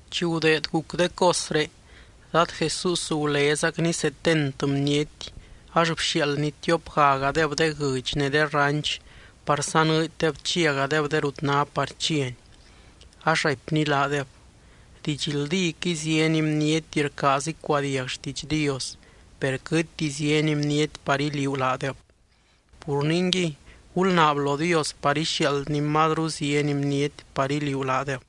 Chi gudeed guc de cosré, Dad Jesús gulézacny setent bniety, ax bxiaaldny tiopgagadeb de guɨdx ne de ranch par sanɨɨdydeb chiagadeb de rut ná par chiany. Ax raipny laadeb: —Didxldíquɨy, zieny bniety rcaaz icuadiag xtiidx Dios, per quɨtti zieny bniety par iliuu laadeb. Pur ningui, gulnaab lo Dios par ixiaaldny mazru zieny bniety par iliuu laadeb.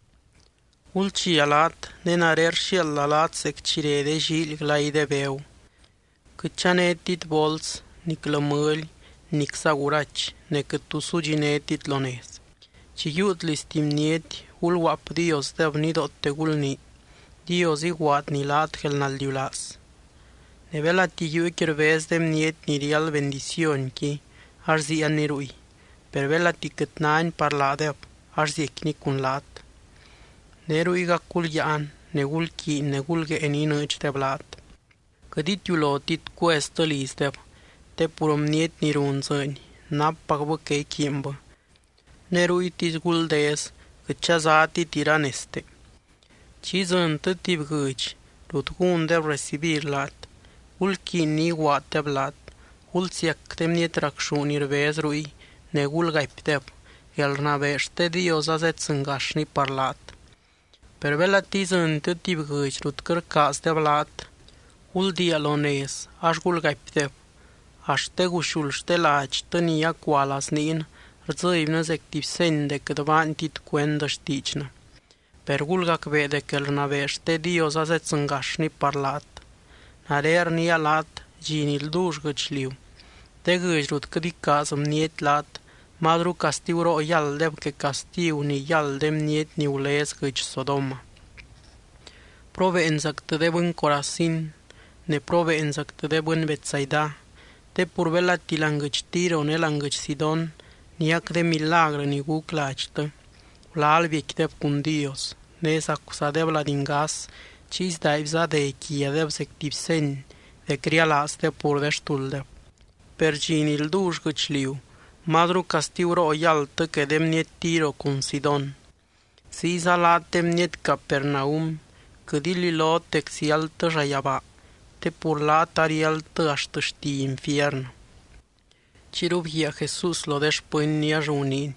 Gulchia laat, ne nare rxiaalda laat zec chi re de llíily glay de begu. Quɨt chanétit bols, niclɨ mɨly, nicza gurachy, ne quɨt tu sudxinétit lo nez. Chi yiiut liz tuby bniety, gulguaapdiosdeb nidoote gulnii: “Dios iguaadny laat guelnaldiulaaz.” Ne belati yuuqui rbez de bniety ni riáld bendicionqui, ax ziianni ruy. Per belati quɨt náni par laadeb ax ziecquini cun laat. Ne ruygac gulyáan, ne gulquiiny ne gulguée ni inɨɨdxdeb laat. Quɨt itiulotit cueztɨ lizdeb te pur bniety ni run dzɨɨny nappacbɨ que iquiinbɨ, ne ruytisy guldez quɨt chazátit iranezte. Chi idzɨntɨ tuby guɨdx rut gúndeb recibir laat, gulquiiny ni iguaaddeb laat. Gulsiac de bniety racxú ni rbez ruy, ne gulgaipdeb: “Guelrnabee xte Dios azeddzɨngaxni par laat.” Per belati idzɨntɨ tuby guɨdx rut quɨt rcaazdeb laat, guldiia lo nez ax gulgaipdeb: “Axt de guxuld xte ladxtɨ ni acua lazniin, rdzɨbynɨ zec tuby seny dec quɨt baantit cuend xtiidxnɨ. Per gulgacbee dec guelrnabee xte Dios azeddzɨngaxni par laat.” Nare rniia laat, dxi ni ldull guɨchliu, de guɨdx rut quɨt icaaz bniety laat mazru castiguroo yálddeb que castigu ni yáld de bniety ni gulez guɨdx Sodoma. ’¡Probeenzactɨ, de bɨny Corazín! Ne, ¡probeenzactɨ, de bɨny Betsaida! Te pur belati láani guɨdx Tiro ne láani guɨdx Sidón niac de milagrɨ ni guc ladxtɨ, gulal biecquideb cun Dios, ne zacuzadeb lady ngas chiy sdaaibza dé quiadeb zec tuby seny dec rialaazdeb pur de xtulddeb. Per dxi ni ldull guɨchliu, mazru castiguroo yáldtɨ que de bniety Tiro cun Sidón. Ziyza laat, de bniety Capernaum, quɨt ililot dec ziáldtɨ llayabaa. Te pur laat ariáldtɨ axt xti infiernɨ. Chiyru bguiaa Jesús lo de xpɨnny ax guniiny: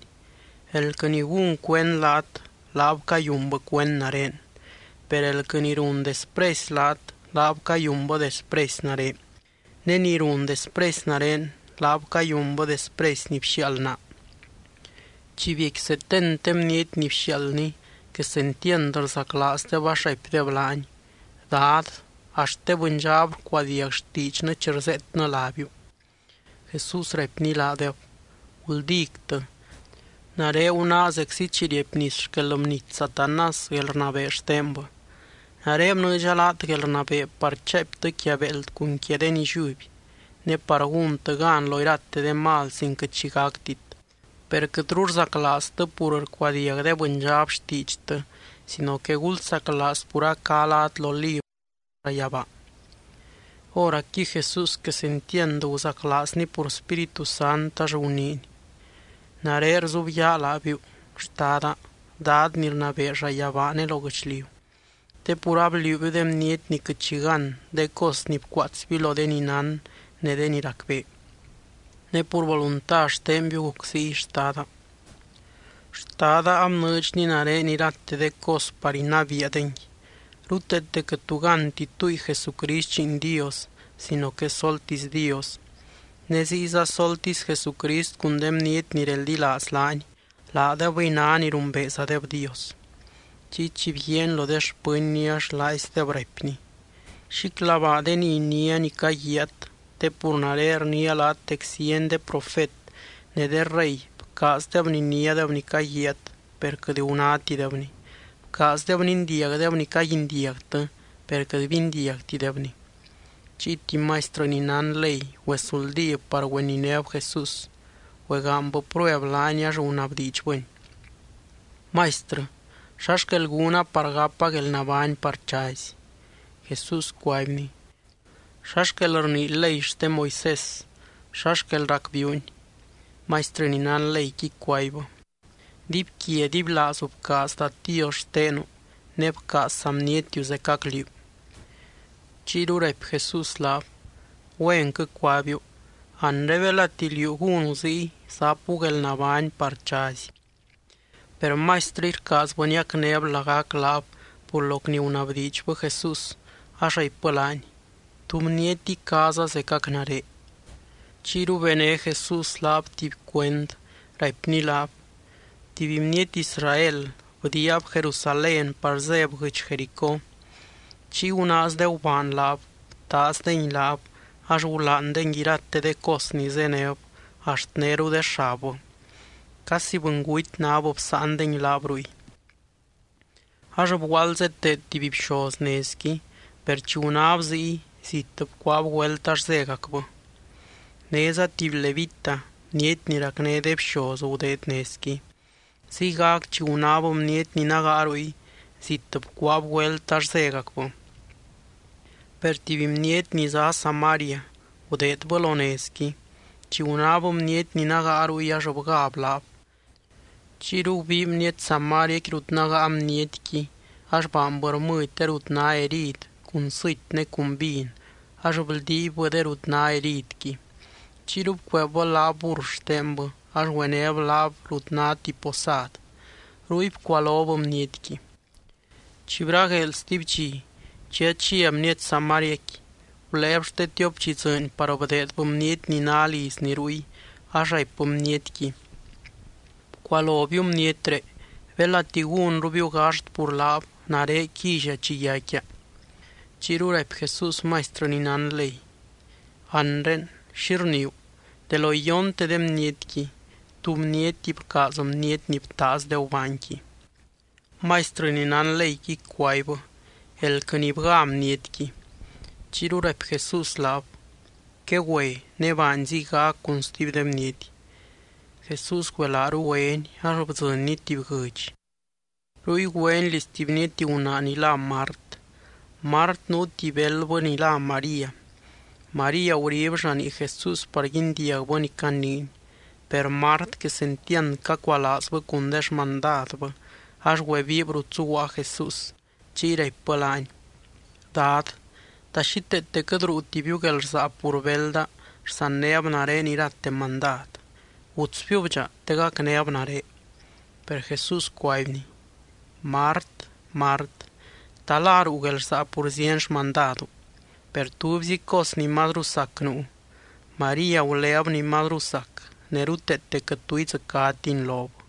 —Elquɨ ni gún cuend laat, laab cayunbɨ cuend nare. Per elquɨ ni run despresy laat, laab cayunbɨ despresy nare. Ne ni run despresy nare, laab cayunbɨ despresy ni bxiaald naa. Chi biecqui setent de bniety ni bxiaaldny, quesentiand rzaclaazdeb ax raipdeb laany: —Dad, axt de bɨndxab rcuadiag xtiidxnɨ chi rzeetnɨ lábiu. Jesús raipny laadeb: —Guldíctɨ. Nare gunáa zeczi chi riepnis xquel bnity Satanás guelrnabee xtenbɨ. Nare bnɨɨdxa laat guelrnabee par chaaiptɨ quia béeld cun quia de nilliuby, ne par gúntɨ gan lo irate de mal sin quɨt xi gactit. Per quɨtru rzaclaaztɨ pur rcuadiag de bɨndxab xtiidxtɨ sino que gulsaclaaz pur a cá lát lo librɨ xte llayabaa. Hóracqui Jesús quesentiand guzaclaazny pur Spíritu Sant ax guniiny: —Nare rzubyaa laabiu, Xtada, Dad ni rnabee llayabaa ne lo guɨchliu, te pur abliuubiu de bniety ni quɨt xi gán de cos ni bcuaatsbiu lo de ni nán ne de ni racbee. Ne pur volunta xtenbiu guc ziy, Xtada. ’Xtada abnɨɨdxny nare irate de cos par inabiia dengui. Ruteete quɨt tu gánti túngui Jesucrist Lliin Dios sino que soltisy Dios, ne ziyza soltisy Jesucrist cun de bniety ni reldilaaz laany, laadebɨy ná ni rumbeezadeb Dios. Chiy chi bguiaany lo de xpɨnny ax laaizdeb raipny: —Xíclabaa de ni iniá ni caguiaat te pur nare rniia laat dec zieny de profet ne de rey bcaazdeb niniádeb ni caguiaat, per quɨt gunátidebni. Bcaazdeb nindiagdeb ni caguindiagtɨ, per quɨt bindiagtidebni. Chiy tuby maistrɨ ni nán ley güesuldíb par güeninéb Jesús. Güegaanybɨ prueb laany ax gunabdiidxbɨny: —Maistrɨ, ¿xa xquel gúna par gapa guelnabány par chazy? Jesús cuaibny: —¿Xa xquel rnii ley xte Moisés? ¿Xa xquel racbiiuni? Maistrɨ ni nán leyqui cuaibbɨ: —“Dibyquia dibylaazu bcaaz Dad Dios xtenu, ne bcaaz saa bnietiu zecac liú.” Chiyru raipy Jesús laab: —Güenquɨ cuabiu. Anre belati liú gúnu ziy, zapu guelnabány par chazy. Per maistrɨqui rcaazbɨ niacnéb lagac laab pur loc ni gunabdiidxbɨ Jesús ax raipbɨ laany: —¿Tú bniety icaaza zecac nare? Chiyru bené Jesús laab tuby cuend, raipny laab: —Tuby bniety Israel bdiiab Jerusalén par zéb guɨdx Jericó. Chiy gunaaz de gubaan laab, btaazdengui laab, ax gulaandengui irate de cos ni zéneb axt néru de xabbɨ. Casi bɨnguty náb bsáandengui laab ruy. Ax bguaald zeteed tuby bxoz nezqui, per chi gunáb ziy, zit bcuaab güelt ax zégacbɨ. Néza tuby levita, bniety ni racné de bxoz, gudeed nezqui. Ziygac chi gunáb bniety ni nágaa ruy, zit bcuaab güelt ax zégacbɨ. Per tuby bniety ni zá Samaria gudeedbɨ lo nezqui. Chi gunáb bniety ni nágaa ruy ax bgáb laab. Chiyru gubii bniety samariaqui rut nágaa bnietqui ax baanbɨ rmɨdy de rut ná herid cun sɨty ne cun vin ax bldiibbɨ de rut ná heridqui. Chiyru bcueebbɨ laab burr xtenbɨ ax güenéb laab rut ná tuby posad. Ruy bcualob bnietqui. Chi bragueel stuby dxi, chi achia bniety samariaqui, guléeb xte tiop dxi dzɨɨny par bdeedbɨ bniety ni ná lizni ruy ax raipbɨ bnietqui: “Bcualobiu bnietré. Belati gúnrubiu gaxt pur laab, nare quilla chi yaicquia.” Chiyru raipy Jesús maistrɨ ni nán ley: —Anre, ¿xi rniiu? De lo iyonte de bnietqui, ¿tú bniety bcaaz bniety ni btaaz de gubaanqui? Maistrɨ ni nán leyqui cuaibbɨ: —Elquɨ ni bgá bnietqui. Chiyru raipy Jesús laab: —Quegüe, ne baany ziygac cun stuby de bniety. Jesús güelaaru güeny ax bdzɨnny tuby guɨdx. Ruy güeny liz tuby bniety gunaa ni lá Mart. Mart nuu tuby beldbɨ ni lá María. María gurib llanii Jesús par guindiagbɨ ni caniiny. Per Mart quesentiand cacualaazbɨ cun de xmandadbɨ, ax güebiib rut zuguaa Jesús. Chiy raipbɨ laany: —Dad, ¿ta xíteete quɨt ruutibiu guelrsaa pur belda rsannéb nare irate mandad? Gutsbiub dxa te gacnéb nare. Per Jesús cuaibny: —Mart, Mart, ¿ta la ruu guelrsaa pur zieny xmandadu? Per tubyzi cos ni mazru sac nuu. María guléb ni mazru sac, ne ruteete quɨt tu idzɨcátini lob.